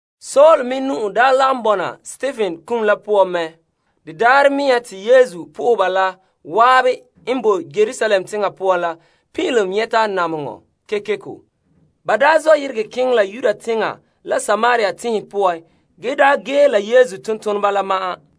Saul me nu'o daa lagom bɔna Stepen kum la poan. De daarɛ mea te lagaŋɔ la zan'an n boe Yerusalem teŋa poan la pin'ilom nyɛta namehegɔ kekeko. Ba daa zɔ' yeregɛ keŋɛ la Yudea teŋa la Samaria tenhen poan ge daa ge la Yesu tontoneba la ma'an.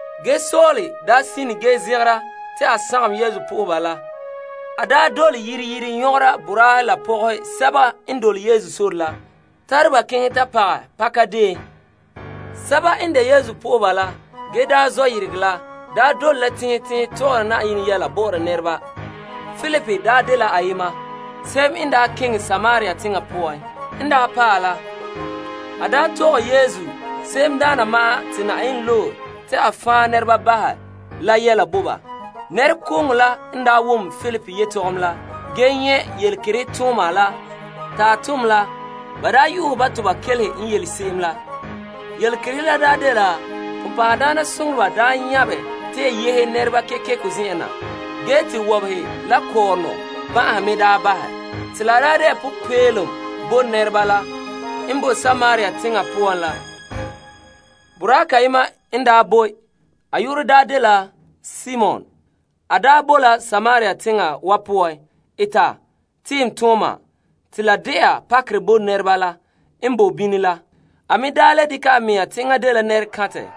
Ge Saul sine ge zegera te a sagom Yesu po'oheba la. A dole yire yire nyɔgera boraahe la pɔgɔhe sɛba n dole Yesu sore la, tare ba keŋɛ ta pagɛ pakadeen. Sɛba n de Yesu po'oheba la gee daa zɔ' yeregɛ la daa dole la teŋhe teŋhe tɔgɔra Yenɛ yɛla bɔ'ɔra nɛreba. Filip dela ayema ge keŋɛ Samaria teŋa poan. En paɛ la, a tɔgɛ Krista se'emdaana ma'an te Yenɛ loe la yɛla bo ba. Nɛrekooŋɔ la n wom Filip yetɔgom la ge nyɛ' yelekerehe tooma la ta tom la, ba yu'uhɛ ba toba kelehe n yele se'em la. Yelekerehe la dela bonbɛ'ɛhe nyabɛ ge yehe nɛreba kekeko zen'en na, ge te wɔbehe la kɔɔrɔnɔ ban'ahe me bahɛ. Te la de'a popeelom bo nɛreba la n bo Samaria teŋa poan la. Boraa kayema n daa boe Samaria teŋa. A yu'urɛ daa dela Simon ge a eta tiimtooma te la de'a pakerɛ bo nɛreba la n bo bini la. A me daa le dekɛ a mea te enŋa dela nɛrekantɛ.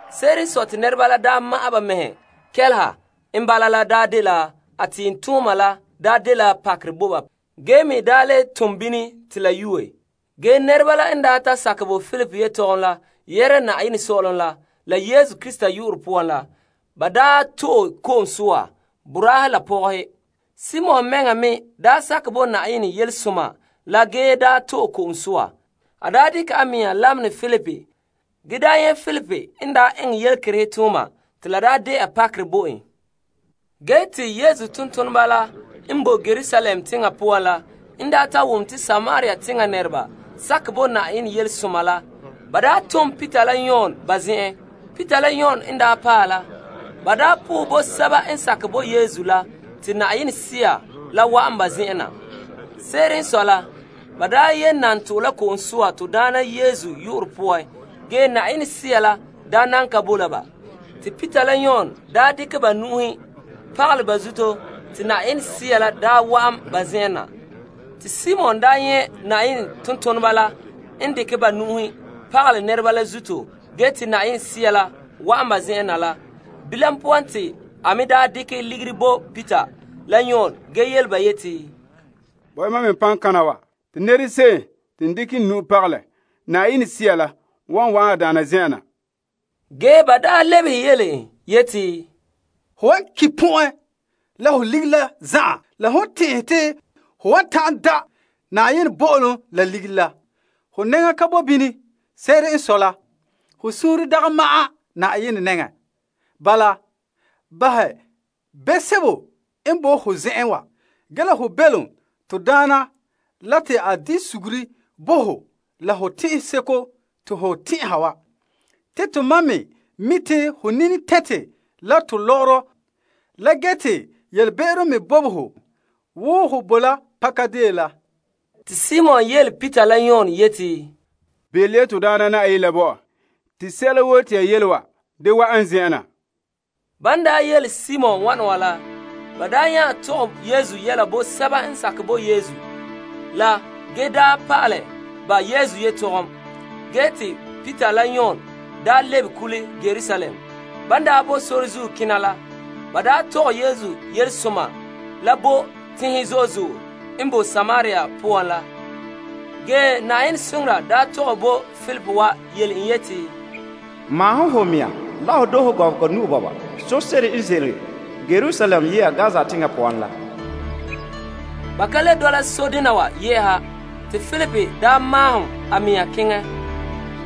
Se'ere n sɔe te nɛreba la daa kɛleha a tiimtooma la n daa tare pakerɛ la me daa le tom bini te la yoe. Ge Filip n wa'an ba zen'an ba ta sakɛ la Filip yetɔgom la yɛhera la Yenɛ Sɔ'ɔlom la Yesu Krista yu'urɛ poan la. Ba me to'e ko'om soa, boraahe la pɔgɔhe. Simon mɛŋa me sakɛ bo Yenɛ Yelesoma la ge to'e ko'om soa. A dekɛ a mea lamenɛ Filip ge nyɛ' Filip n daa eŋɛ yelekerehe tooma te la de'a pakerɛ bo en. Ge te Yesu tontoneba la n boe Yerusalem teŋa poan la n daa ta wom te Samaria teŋa nɛreba sakɛ bo Yenɛ Yelesoma la, ba tom Peter la Yon ba zen'en. Peter la Yon n daa ta paɛ la, ba sohɛ bo sɛba n sakɛ bo Yesu la te Yenɛ Sea la wa'an ba zen'an na. Se'ere n sɔe la, ba daa yee nan to'e la ko'om soa to Daana Yesu yu'urɛ poan ge Yenɛ Sea la daa nan ka boe la ba. Te Peter la Yon dekɛ ba nu'uhen pagalɛ ba zuto te Yenɛ Sea la wa'an ba zen'an na. Te Simon nyɛ' Yenɛ tontoneba la n dekɛ ba nu'uhe pagalɛ nɛreba la zuto ge te Yenɛ Sea la wa'an ba zen'an la. Bilam poan te a me dekɛ ligiri bo Peter la Yon ge yele ba yeti, Bo' ya mam me paŋkana wa, te nɛrese'em te n dekɛ n nu'uhe pagalɛ, Yenɛ Sea la wan wa'an a daana zen'an na. Ge Peter lebehe en yeti, Ho wan ki' pɔn'ɛn la ho ligiri la zan'an la hon tɛn'ɛhe te ho wan ta'an da' Yenɛ bo'olom la ligiri la. Ho nɛŋa ka boe bini. Se'ere n sɔe la, ho suunre dagɛ ma'an Yenɛ nɛŋa. Bala, bahɛ be'em sebo n boe ho zen'an wa ge la ho belom to Daana la te a di suguru bo ho la ho tɛn'ɛn seko te ho tɛn'ɛha wa. Te tomam mi' te ho nini tɛnte la to lɔgɔrɔ la ge te yelebe'ero me bobe ho wo ho boe la pakadeen la. Te Simon yele Peter la Yon yeti, Belom ya to Daana Na'ayenɛ la bo ɔ te sɛla woo te ya yele wa da wa'an n zen'en na. Peter la Yon nya tɔgɛ Yesu yɛla bo sɛba n sakɛ bo Yesu la ge pa'alɛ ba Yesu yetɔgom te ba lebe kule Yerusalem. Ge ban boe sore zuo kena la, ba tɔgɛ Yesu Yelesoma la bo tenhen zo'e zo'e n boe Samaria poan la. Ge Na'ayenɛ soŋora nya tɔgɛ bo Filip wa yele en yeti, Maahom ho mea la ho doohe gɔbega nu'o sore se'ere n ze'ele Yerusalem ye'a Gaza teŋa poan la. Ba ka le dɔla sodena wa yɛ'ɛha. Te Filip maahom a mea keŋɛ.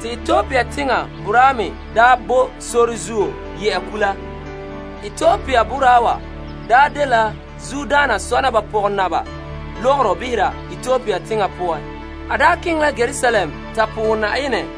Te Etiopia teŋa boraa me boe sore zuo ye'a kula. Etiopia boraa wa dela zuodaana sɔna ba pɔgɔnaba lɔgɔrɔ behera Etiopia teŋa poan ge te a daa keŋɛ la Yerusalem ta sohɛ Yenɛ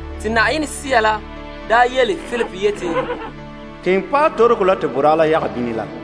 Te Sea la yele Filip yeti, Keŋɛ paɛ toroko la te boraa la yaga bini la.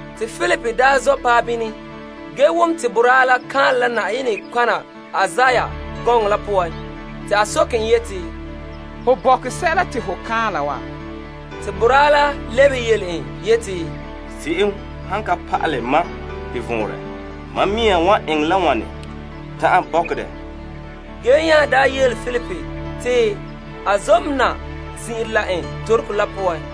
Te Filip zɔ' paɛ bini ge wom te boraa la kan'anlɛ la Yenɛ nɔtɔgɔha Isaiah gɔŋɔ la poan. Te a soke en yeti, Ho bɔkɛ sɛla te ho kaanla wa? Te boraa la lebehe en yeti, Se'em han ka pa'alɛ mam de vɔnrɛ, mam mea wan eŋɛ la wane ta'an bɔkɛ dɛ? Ge nya daa yele Filip te a zona zin'ire la n toroko la poan.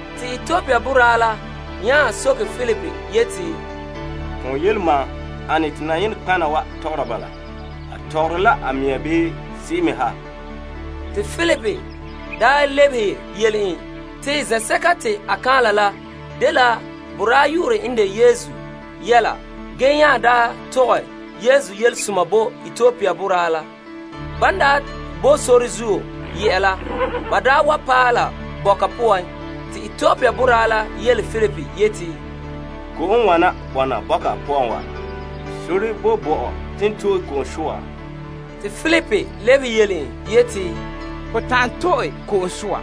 Te Etiopia boraa la nya soke Filip yeti, Ton yele mam, ane te Yenɛ nɔtɔgɔha wa tɔgɔra bala? A tɔgɔre la a mea bii se'em me ha? Te Filip lebehe yele en te zen'sɛka te a kaanla la dela boraa yu'urɛ n de Yesu yɛla ge nya tɔgɛ Yesu Yelesoma bo Etiopia boraa la. Ban daa bo sore zuo ye'a la, ba wa paɛ la bɔka poan. Te Etiopia boraa la yele Filip yeti, Ko'om n wana bɔna bɔka poan wa. Sore boe bo mam te n to'e ko'om soa? Te Filip lebehe en yeti, Ho ta'an to'e ko'om soa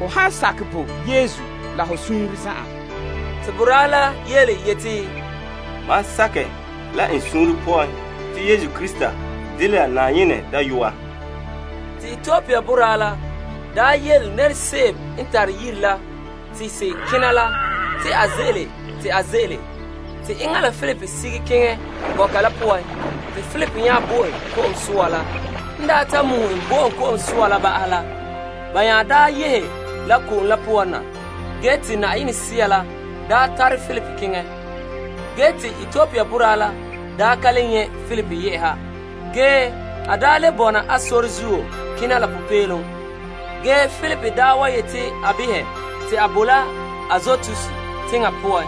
ho han sakɛ bo Yesu la ho suunre zan'an. Te boraa la yeti, Mam sakɛ la n suunre poan te Yesu Krista dela Yenɛ Dayɔa. Te Etiopia boraa la yele se'em n tare yiri la te se kena la te a ze'ele te a ze'ele. Te enŋa la Filip sige keŋɛ bɔka la poan te Filip nya bo en ko'om soa la. Filip n ta muhe en bo en ko'om soa la ba'ahɛ la, ba nya yehe la ko'om la poan na ge te Yenɛ Sea la tare Filip keŋɛ. Te Etiopia boraa la ka le nyɛ' Filip yɛ'ɛha ge a le bɔna a sore zuo kena la popeelom. Ge Filip wa yete a behɛ te a boe la Azotas teŋa poan.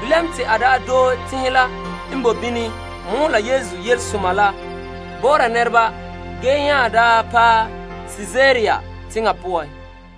Bilam te a daa doohe teŋhe la n boe bini mɔɔla Yesu Yelesoma la bɔ'ɔra nɛreba ge nya paɛ Kaesarea teŋa poan.